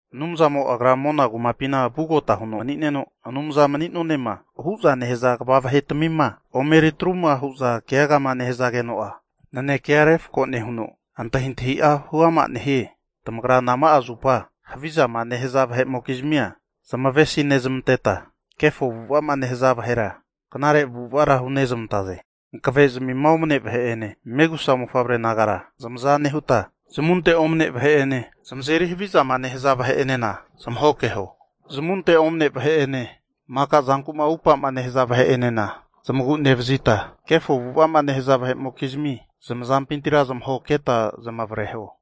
Anumzamo Agra mona kumapina vugota huno mani'neno, anumza mani'nonema huza nehaza kva vahetamima omeritruma hu'za keagama nehazageno'a, nanekea refko nehuno antahintahi'a huama nehie. Tamagra nama'a zupa havizama nehaza vahe'mokizmia zamavesi nezmanteta, kefo avu'ava'ma nehaza vahera knare avu'avara hunezmantaze? Hankavezmima omne vahe'ene megusa mofavre nagara zamaza nehuta, zamunte omne vahe'ene zamazeri havizama nehaza vahe'enena zamahokeho. Zamunte omne vahe'ene maka zanku'ma upa'ma nehaza vahe'enena zamagu'nevazita kefo avu'ava'ma nehaza vahe'mokizmi zamazampintira zamahoketa zamavareho.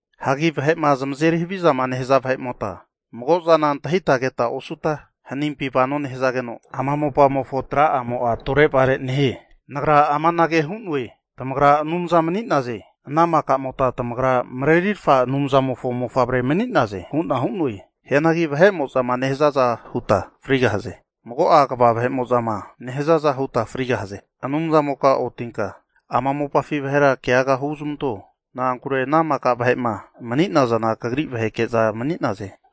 Hagi vahe'ma zamazeri havizama nehaza vahe'mota, mago zana antahita keta osuta hanimpi vano nehazageno, ama mopamofo tra'amo'a tore'vare nehie. Nagra amanage hu'noe, tamagra anumza mani'naze, ana makamota tamagra Marerirfa Anumzamofo mofavre mani'naze hu'na hu'noe. Hianagi vahe'mo'zama nehazaza huta frigahaze. Mago'a kva vahe'mo'zama nehazaza huta frigahaze. Anumzamoka otinka ama mopafi vahera keaga huzmanto. Na'ankure ana maka vahe'ma mani'nazana kagri vaheke'za mani'naze.